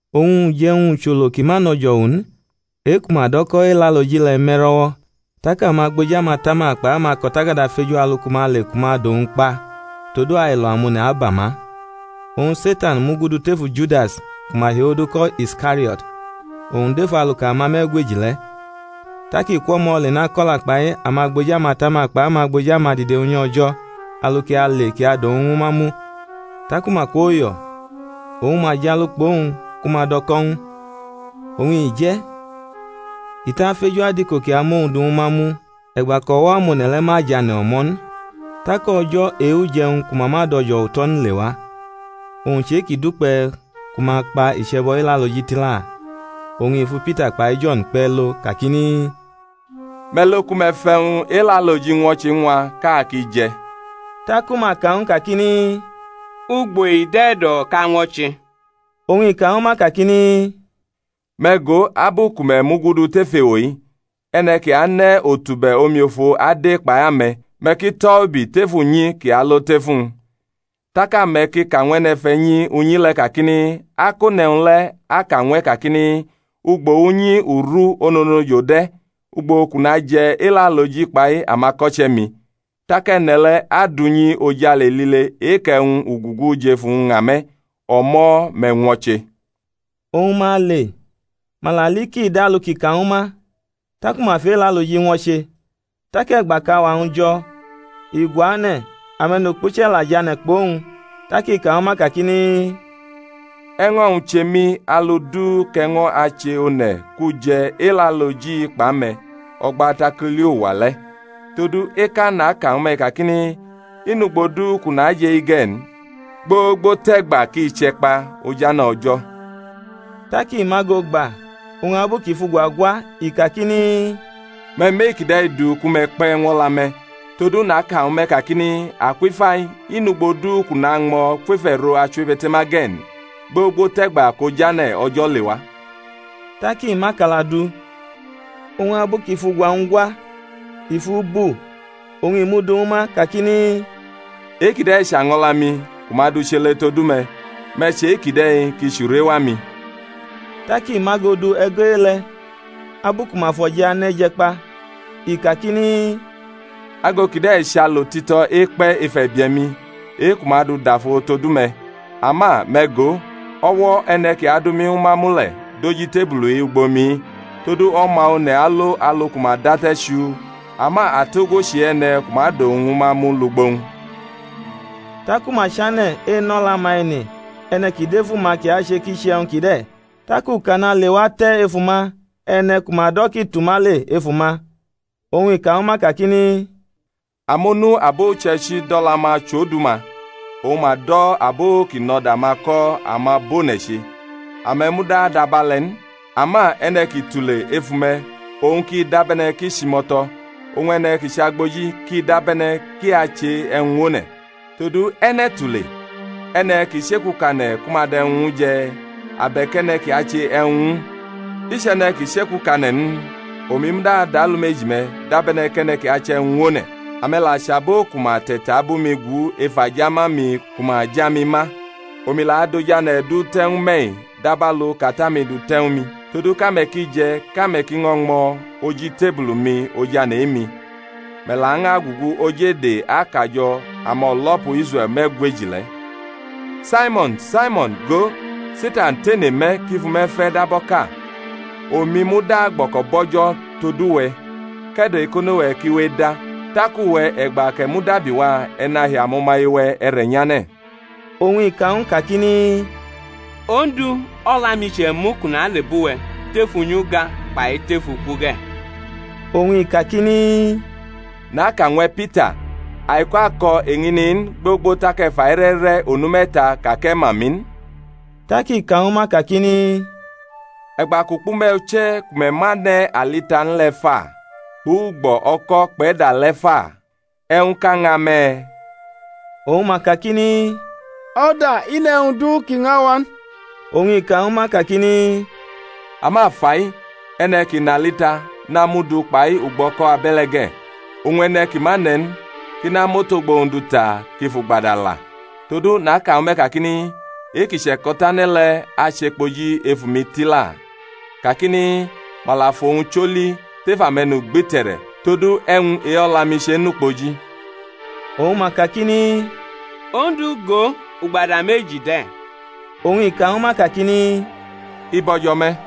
Oñ uje̩wñ-ucholo ki ma nʼo̩jo̩wu n, e-ku ma do̩ ko̩ Elaloji le̩ me̩ro̩wo̩. Tak amagboji amatama kpai amako̩takada feju alu ku ma ale ku ma dʼowñ kpa; todu ailo amone̩ aba ma. Oñ Setan mugudu tefu Judas, ku ma hiodu ko̩ Iskario̩t, owñ dʼef aluka amame̩gweji le̩. Tak i kwʼo̩mo̩ le nako̩la kpai amagboji amatama kpai amagboji amadide Unyi O̩jo̩, alu kʼi ale kʼi adʼowñ ñwu ma mu. Taku ma kwoyo̩, oñ ma jalu kpʼowñ ku ma dʼo̩ko̩ ñw u. Oñ i je̩, i tʼafeju adiko kʼi amʼowñ du ñwu ma mu e̩gba kʼo̩wo̩ amone̩ le̩ ma jʼane̩ o̩mo̩ n. Tak o̩jo̩ e-uje̩wñ ku ma ma dʼo̩jo̩wu tʼo̩ n lewa, owñ chʼe-kʼi dukpe̩ ku ma kpa iche̩bo̩ Elaloji tila. Oñ i fu Pita kpai Jo̩n kpe̩ lo kakini, Me̩ lo ku me̩ fʼe̩wñ Elaloji ñwo̩che ñw a kʼa ki je̩. Taku ma ka ñw u kakini, Ugbo i dʼe̩ e̩do̩ kʼa ñwo̩che? Oñ i ka ñwu ma kakini, Me̩ go, abu ku me̩ mugudu tef ewo-i, e̩ne̩ ki ane̩ otube̩ omiofo ade kpai ame̩: me̩ ki tʼo̩ ubi tef unyi kʼi alo tʼefu-wñ. Tak ame̩ ki ka ñw e̩ne̩fe̩nyi unyi le̩, kakini, Akone̩wñ le̩ aka ñw e̩ kakini, Ugbo unyi uru ononojo de̩ ugbo kʼu naje̩ Elaloji kpai amako̩che̩-mi? Tak e̩ne̩ le̩ adʼunyi-ojale lile e-kʼe̩wñ ugugu jʼefu-wñ ña me̩; o̩mo̩ me̩ ñwo̩che. Oñ ma le, ma la li kʼi dʼalu kʼi ka ñwu ma. Taku ma fʼElaloji ñwo̩che. Tak e̩gba kʼauwa-wñ jo̩, i guane̩, ame̩nukpuche̩ la jʼane̩ kpʼowñ. Tak i ka ñwu ma kakini, E̩ño̩-wñ che mi alu du kʼe̩ño̩ ache one̩ kʼu je̩ Elaloji-i kpʼame̩ o̩gba tak u li uwa le̩; todu eka naka ñwu me̩-i kakini, I nʼugbo du kʼu najʼe-i ge̩ n, gbogbo tʼe̩gba kʼi che̩kpa ojane̩ O̩jo̩. Tak i mʼago gba oñ abu kʼi fʼugwa gwa, i kakini, Me̩ mʼe-kide̩ du ku me̩ kpe̩ ñw o̩la-me̩: todu naka ñwu me̩ kakini, Akwʼifai i nʼugbo du kʼu nañmo̩ kwef e̩ro achiwebe̩te̩ma ge̩ n, gbogbo tʼe̩gba kʼojane̩ O̩jo̩ lewa. Tak i mʼakala du oñ abu kʼi fʼugwa-wñ gwa, i fʼu bu, oñ i mʼu du ñwu ma, kakini, E-kide̩ chʼaño̩la-mi [ku ma du chele todu me̩: me̩ che e-kide̩ kʼi chʼurewa-mi. Tak i mʼago du e̩go̩ e-le̩ abu ku ma fʼo̩je̩ ane̩ je̩ kpa, i kakini. Ago kide̩ chʼalo tito̩ ekpe̩ ef e̩bie̩-mi, e-ku ma du dafo todu me̩.] Ama me̩ go, o̩wo̩ e̩ne̩ kʼi adu mi ñwu ma mu le̩ dʼoj itebulu-i ugbo mi-i. Todu O̩ma One̩ alo alu ku ma date̩ chuu; ama atogwo ki chʼe-e̩ne̩ ku ma dʼowñ ñwu ma mu lugbo-wñ! Taku ma chane̩ enʼo̩la-ma ene, e̩ne̩ ki dʼefu ma kʼi ache kʼi che e̩wñ kide̩. Tak ukana lewa te̩ ef uma, e̩ne̩ ku ma do̩ kʼi tʼuma le ef uma. Oñ i ka ñw ma kakini, Amonu abo uche̩ichi dʼo̩la-ma chʼodu-ma; oñ ma do̩ abo ki nʼo̩da-ma ko̩ amabʼone̩ che. Ame̩ muda adʼabe̩le̩ n; ama e̩ne̩ ki tule ef ume̩, owñ ki dabe̩ne̩ kʼi chʼimo̩to̩; oñ e̩ne̩ ki chʼagboji kʼi dabe̩ne̩ kʼi ache e̩wñ ñw one̩. Todu e̩ne̩ tule? e̩ne̩ ki chekukane̩ ku ma dʼe̩wñ ñw u je̩? abe̩k e̩ne̩ kʼi ache e̩wñ ñw u? I chʼe̩ne̩ ki chekukane̩ n? Omi muda dʼalumeji-me̩ dabe̩ne̩ kʼe̩ne̩ ki ache e̩wñ ñw one̩. Ame̩ la chʼabo ku ma te̩tabʼumi gu ef ajama-mi ku ma ja mi ma. Omi la adʼojane̩ du te̩ ñw me̩-i dabalu kʼAta-mi dute̩ ñw mi, todu kʼame̩ ki je̩ kʼame̩ ki ño̩ ñmo̩ oj itebulu-mi ojane̩ e-mi; me̩ lañʼagugu oj ede akajo̩ amo̩lo̩pu Israe̩l me̩gweji le̩. Saimo̩n, Saimo̩n, go, Setan tene me̩, kʼi fʼume̩ fe̩ dab o̩ka; omi muda gbo̩ko̩bʼO̩jo̩ todu we̩ kʼe̩do̩-ekono-we̩ ki we eda; tak uwe̩ e̩gba kʼe̩ mudabiwa e̩ nahi amo̩maye-we̩ e̩re̩ nyane̩. Oñ i ka ñw u kakini, Ondu, o̩la-mi che̩mu kʼu na le bʼuwe̩ tef unyi uga kpai tef uku ge̩. Oñ i kakini, Naka ñw e̩ Pita, aiko̩ ako̩ eñini n, gbogbo tak e̩ fʼaire̩ re̩ onu me̩ta ka kʼe̩ ma mi n. Tak i ka ñwu ma kakini, E̩gba kʼu kpʼume̩ uche̩ ku me̩ ma ne̩ alita n le̩ fa? kpʼugbo̩ o̩ko̩ kpʼe̩da le̩ fa? e̩wñʼka ña me̩? Oñ ma kakini, O̩da, i nʼe̩wñ du ki ña wa n. Oñ i ka ñwu ma kakini, Ama fa-i, e̩ne̩ ki nʼalita namʼu du kpai ugbo̩ o̩ko̩ abe̩le̩ ge̩; oñ e̩ne̩ ki ma ne̩ n kʼi namʼotogbo-wñ du ta kʼi fʼugbada la. Todu naka ñwu me̩ kakini, E-ki che̩ko̩tane̩ le̩ achekpoji efu mi tila, kakini, Ma la fʼowñ choli tef ame̩nugbite̩re̩: todu e̩wñ e-o̩la-mi chenʼukpoji. Oñ ma kakini, Ondu, go, ugbada meji de̩. Oñ i ka ñwu ma kakini, I bo̩jo̩ me̩.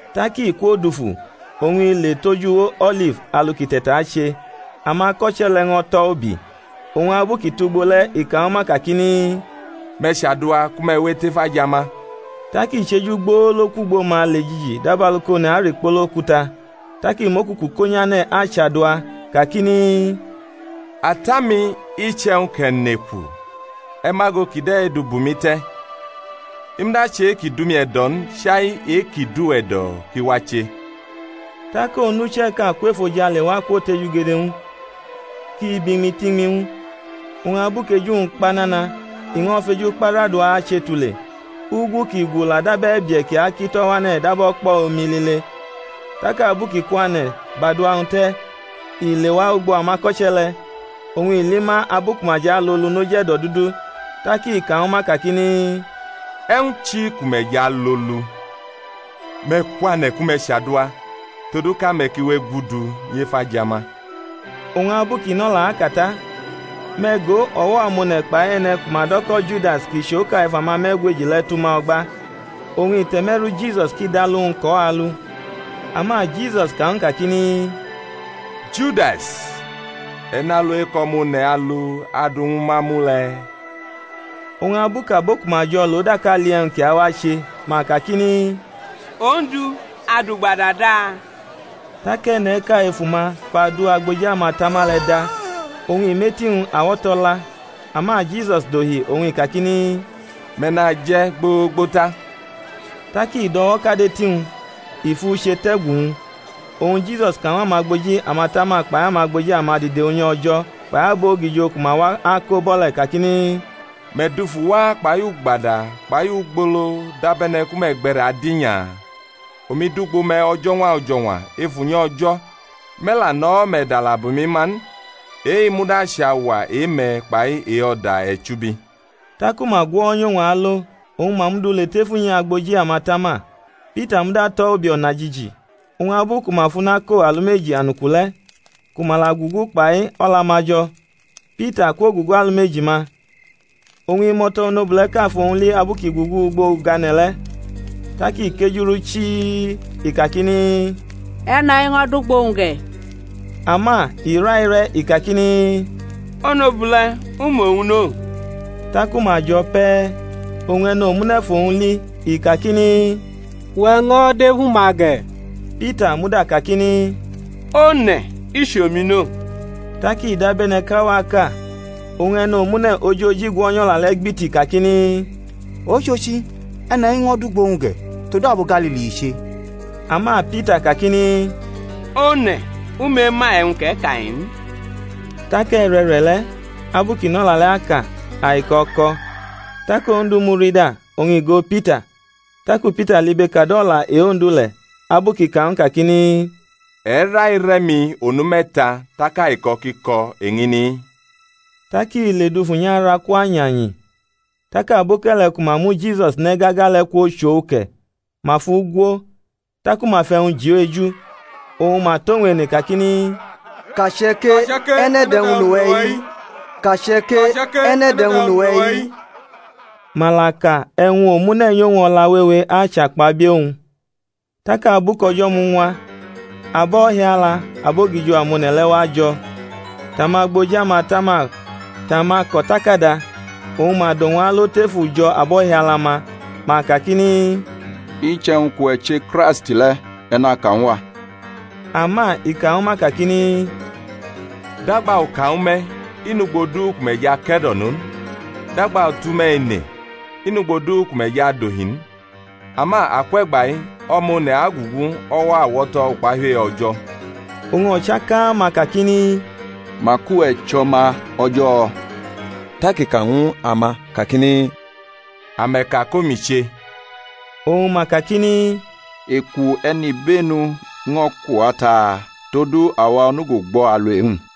Tak i kwodufu oñ i le tʼoj uwo O̩lif alu kʼi te̩tache; amako̩che̩ le̩ ño̩ tʼo̩ ubi. Oñ abu kʼi tʼugbo le̩ i ka ñwu ma kakini, Me̩ chadua ku me̩ we etʼef ajama. Tak i chejugbolo kwʼugbo ma le jiji dabalu kʼone̩ arikpolo okuta; tak i mʼokuku ko nyane̩ achadua, kakini, Ata-mi, iche̩wñ kʼe̩ neku e̩ mʼago kide̩ du bʼumi te̩: i muda chʼe-ki dʼumi e̩do̩ n chai e-ki dʼuwe̩ e̩do̩ kʼi wache. Tak onucheʼka kwʼefojale wa kwotejugede ñw u ki bʼiñmi tʼiñmi ñw u. Oñ abu kʼeju-wñ kpa nana i no̩ feju kpa rʼadua ache tule; ugu kʼi gu la dab e̩bie̩ ki akito̩ wane̩ dab o̩kpo̩ omi lile. Tak abu kʼi kwane̩ bʼadua-wñ te̩ i lewa ugbo amako̩che̩ le̩, oñ i li ma abu ku ma jʼalolu noj e̩do̩dudu. Tak i ka ñwu ma, kakini, E̩wñ chi ku me̩ jʼalolu? Me̩ kwane̩ ku me̩ chadua, todu kʼame̩ ki we egudu nyef ajama. Oñ abu kʼi nʼo̩la aka ta, me̩ go, o̩wo̩ amone̩ kpai e̩ne̩ ku ma do̩ ko̩ Judas kʼi chʼoka ef amame̩gweji le̩ tʼuma o̩gba, oñ i te̩me̩ru Jisus kʼi dʼalu-wñ kʼo̩ alu. Ama Jisus ka ñw u kakini, Judas, e̩ nʼalu ekʼO̩ma One̩ alu adu ñw u ma mu le̩? Oñ abu kʼabo ku ma jo̩ lʼo daka li e̩wñ ki awa-che, ma kakini, Ondu, a dʼugbada da? Tak e̩ne̩ʼka efu ma fʼadu agboji amatama le̩ da, oñ i mʼeti-wñ awo̩to̩ la. Ama Jisus dohi oñ i kakini, Me̩ naje̩ gbogbo ta. Tak i dʼo̩wo̩ kad eti-wñ, i fʼu che tʼe̩gu-wñ. Oñ Jisus ka ñw amagboji amatama kpai amagboji amadide unyi O̩jo̩ kpai abogijo ku ma wa ako bʼo̩ le̩ kakini, Me̩ dufu wa kpai ugbada kpai ugbolo dabe̩ne̩ ku me̩ gbe̩re̩ adinya? Omi dʼugbo me̩ o̩jo̩ñwa o̩jo̩ñwa ef unyi O̩jo̩, me̩ la nʼo̩wo̩-me̩ dala bʼumi ma n: e-i muda chʼauwa e-me̩ kpai e-o̩da e̩chubi. Taku ma gwo̩nyʼowñ alo, oñ ma mʼu du le tef unyi agboji amatama. Pita muda tʼo̩ ubi o̩najiji. Oñ abu ku ma fʼuna ko alumeji anuku le̩, ku ma la gugu kpai o̩la-ma jo̩. Pita kwogugu alumeji-ma. Oñ imo̩to̩ onobule̩ʼka fʼowñ li abu kʼi gugu ugbo ugane̩ le̩, tak i kejurʼu chii, i kakini, E̩ne̩-i ño̩ dʼugbʼowñ ge̩. Ama i raire̩, i kakini, Onobule̩, u mʼowñ no. Taku ma jo̩ pe̩, oñ e̩nomune̩ fʼowñ li, i kakini, Uwe̩ ño̩ dʼefu ma ge̩. Pita muda kakini, One̩, i chʼomi no. Tak i dabe̩ne̩ kʼauwaʼka oñ e̩nomune̩ ojoji gwo̩nyʼo̩la le̩ gbiti kakini, Ochochi e̩ne̩-i ño̩ dʼugbʼowñ ge̩; todu abo Galili i che. Ama Pita kakini, One̩, u mema e̩wñ kʼe̩ ka-i n. Tak e̩re̩re̩le̩ abu kʼi nʼo̩la le̩ aka, aiko̩ ko. Tak Ondu murida, oñ i go Pita. Taku Pita libekadʼo̩la e-Ondu le̩, abu i kʼi ka ñw u kakini, E̩ raire̩ mi onu me̩ta tak aiko̩ ki ko̩ eñini-i. Tak i ledufu nyʼaraku anyanyi. Tak aboke̩le̩ ku ma mu Jisus ne̩ gaga le̩ kwochʼo uke̩, ma fʼu gwo. Taku ma fʼe̩wñ ji u eju, oñ ma tʼowñ ene kakini, Kache̩ ke: e̩ne̩ dʼe̩wñ nʼuwe̩-i? Ma la ka e̩wñ omune̩ nyʼowñ o̩la wewe achakpabie̩ owñ. Tak abu kʼo̩jo̩ muñwa, abo̩hiala abogijo amone̩ le̩ wajo̩, tʼamagboji amatama tʼamako̩takada; oñ ma dʼowñ alo tef ujo̩ abo̩hiala-ma, ma kakini, Iche̩wñ kʼuwe̩ che Kraist le̩, e̩ naka ñw a. Ama i ka ñwu ma kakini, Dagba u ka ñwu me̩, i nʼugbo du ku me̩ jʼake̩do̩no n: Dagba u tʼume̩ ene, i nʼugbo du ku me̩ jʼadohi n. Ama akwʼe̩gba-i O̩ma One̩ agugu o̩wo̩ awo̩to̩ ukpahiu e-O̩jo̩. Oñ o̩chaka ma kakini, Mak uwe̩ chʼO̩ma O̩jo̩? Tak i ka ñw ama kakini, Ame̩ ka kʼomi che. Oñ ma kakini, Eku e̩nibenu ño̩ ku wa taa? Todu awa onugo gbo̩ alu e-wñ.